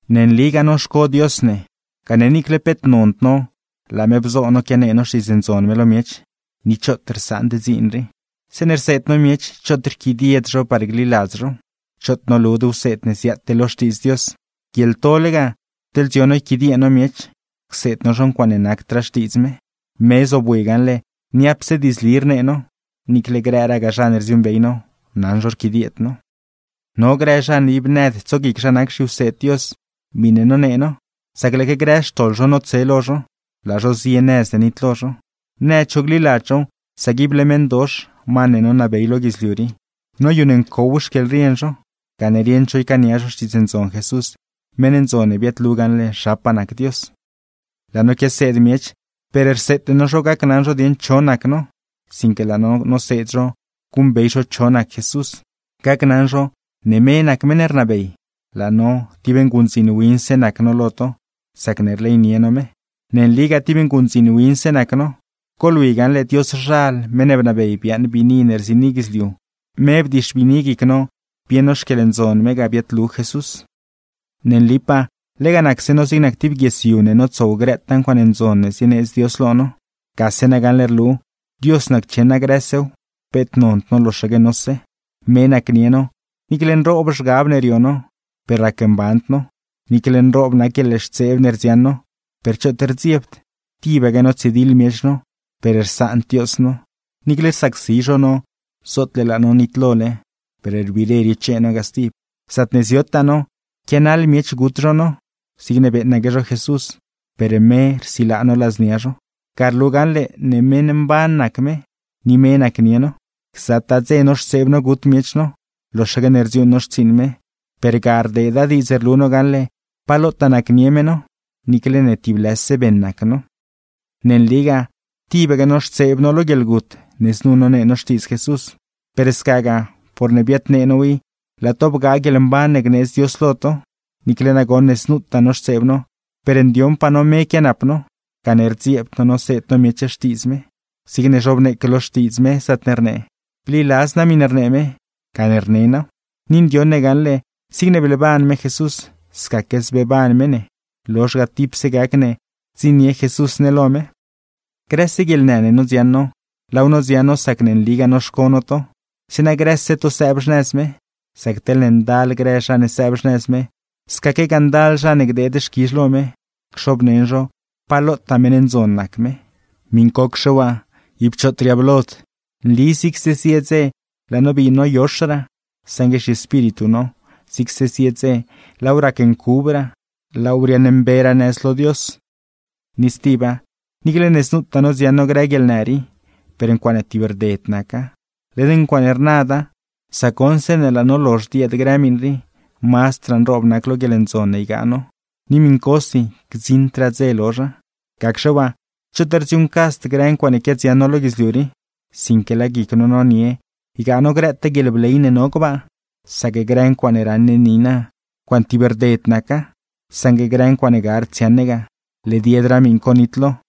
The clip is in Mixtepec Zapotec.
Ne nligaa noxco Dios ne, gane niicle peet nond no laa me bzo no quianee no Xtiidz Ndzon me lo miech; ni choot rsaand dziin rii. Zeeṉe rseed no miech, choot rquidied zho par gliladz zhow. Choot nolud wseed ne ziaate lo Xtiidz Dios; guieḻtole ga, teḻ dzio no yquidiee no miech, cseed no zho ncuaaṉe nacdraa Xtiidz me. Me zobwi gaṉle niapse diidzli rnee no, niicle grëgaa zha ne rdziuuṉbey no, naṉ zho rquidieed no. No grë zha ne ib nëd tsoguic zha nac zhiwseed Dios miṉe nonee no; sac lëëque grë xtoḻ zho notse lo zho, laa zho zie nëz ne nitlo zho. Nëd zho gliladz zhow, sac ible meṉdox (ma ne nonabey lo guidzliu rii) noyuṉ ncow xquieḻrien zho; gane rieṉd zho ycaania zho Xtiidz Ndzon Jesús, meṉ ndzon ne biaadlu gaṉle zhapaa nac Dios. Laa no quiaseed miech, per rseete no zho gacnaṉ zho dieṉ cho nac no, sinque laa no noseed zho guṉbey zho cho nac Jesús. Gacnaṉ zho, ne me nac meṉ ne rnabey; laa no, tib nguṉdziin winse nac no lo to, sacne rleynie no me. ¡Ne nligaa tib nguṉdziin winse nac no! Goḻwi gaṉle Dioszhal, meṉ ne bnabey biaaṉ biini ne rziini guidzliu, me bdixbiini guic no bieṉ no xquieḻndzon me ga biaadlu Jesús. Ne nlipaa, lega nacse no zig nac tib guies yu ne notsow grëtaa ncuaaṉe ndzon ne zieneedz Dios lo no. Gase na gaṉle rlu, Dios naccheṉa grësew, peet nond no loxaque nose. Me nacnie no, niicle nroob zhgab ne rio no, per racmband no; niicle nroob nac guieḻxtseeb ne rdziaṉ no, per choot rdziebd. Tibaque notsidiḻ miech no, per rsaand Dios no; niicle rsacsi zho no zootle laa no nitlole, per rbiire riochee no ga stib. Zaatne ziotaa no, quianaḻ miech gut zho no, zigne beeṉaque zho Jesús; per me rsilaa no ladznia zho. Ga rlu gaṉle ne meṉ mban nac me, ni me nacnie no. Gzataa dze noxtseeb no gut miech no, loxaque ne rdziuuṉ no xtsiiṉ me; per ga rdeeda diidz rlu no gaṉle pa lotaa nacnie me no, niicle ne tib lëse beṉ nac no. Ne nligaa, tibaque noxtseeb no lo guieḻgut ne znu nonee no Xtiidz Jesús; per scagaa, porne biadnee now i laa to bgaa guieḻmban ne gneedz Dios lo to. Niicle nagoṉ ne znutaa noxtseeb no, per ndioṉpaa no me quianap no, gane rdzieebd no noseed no miech Xtiidz me; zig zhobneeque lo Xtiidz me, zaatne rnee: “Bliladz naa miṉe rnee me, gane rne naaw.” Ni ndioṉ ne gaṉle, zigne bleeban me Jesús, scaque zbeeban me ne, lozh ga tipse gac ne gdziṉnie Jesús ne lo me. Grëse guieḻnë ne nodziaṉ no, laaw nodziaṉ no sacne nligaa noxco no to; zeeṉa grëse to sëëb xnëz me. Sac teḻne ndal grë zha ne sëëb xnëz me, scaquegaa ndal zha ne gdeed xquizh lo me, cxobneṉ zho pa lotaa meṉ ndzon nac me. Miṉcocxe waa, ib choot riablod. Nli zigse zie dze laa no bii noyoxraa, saṉgue zhiespíritu no, zigse zie dze laaw racncubraa, laaw riaaṉmberaa nëz lo Dios. Ni stiba, niicle ne znutaa nodziaṉ no grë guieḻnë rii, per ncuaaṉe tib rded naca, led ncuaaṉe rnada; sac goṉ, zeeṉe laa no lozh dieed grë miṉ rii, mazdraa nroob nac lo guieḻndzon ne ygaa no, ni miṉcosi gdziṉdraa dze lozha. Gacxe waa, choot rdziuuṉcasd grë ncuaaṉe quiadziaṉ no lo guidzliu rii, sinque laa guic no nonie ygaa no grëtaa guieḻbley ne no gbaa. Sac grë ncuaaṉe raṉ ne niina, ncuaaṉe tib rded naca; saṉgue grë ncuaaṉe gard dziaṉ ne ga, led yedraa miṉ co nitlo.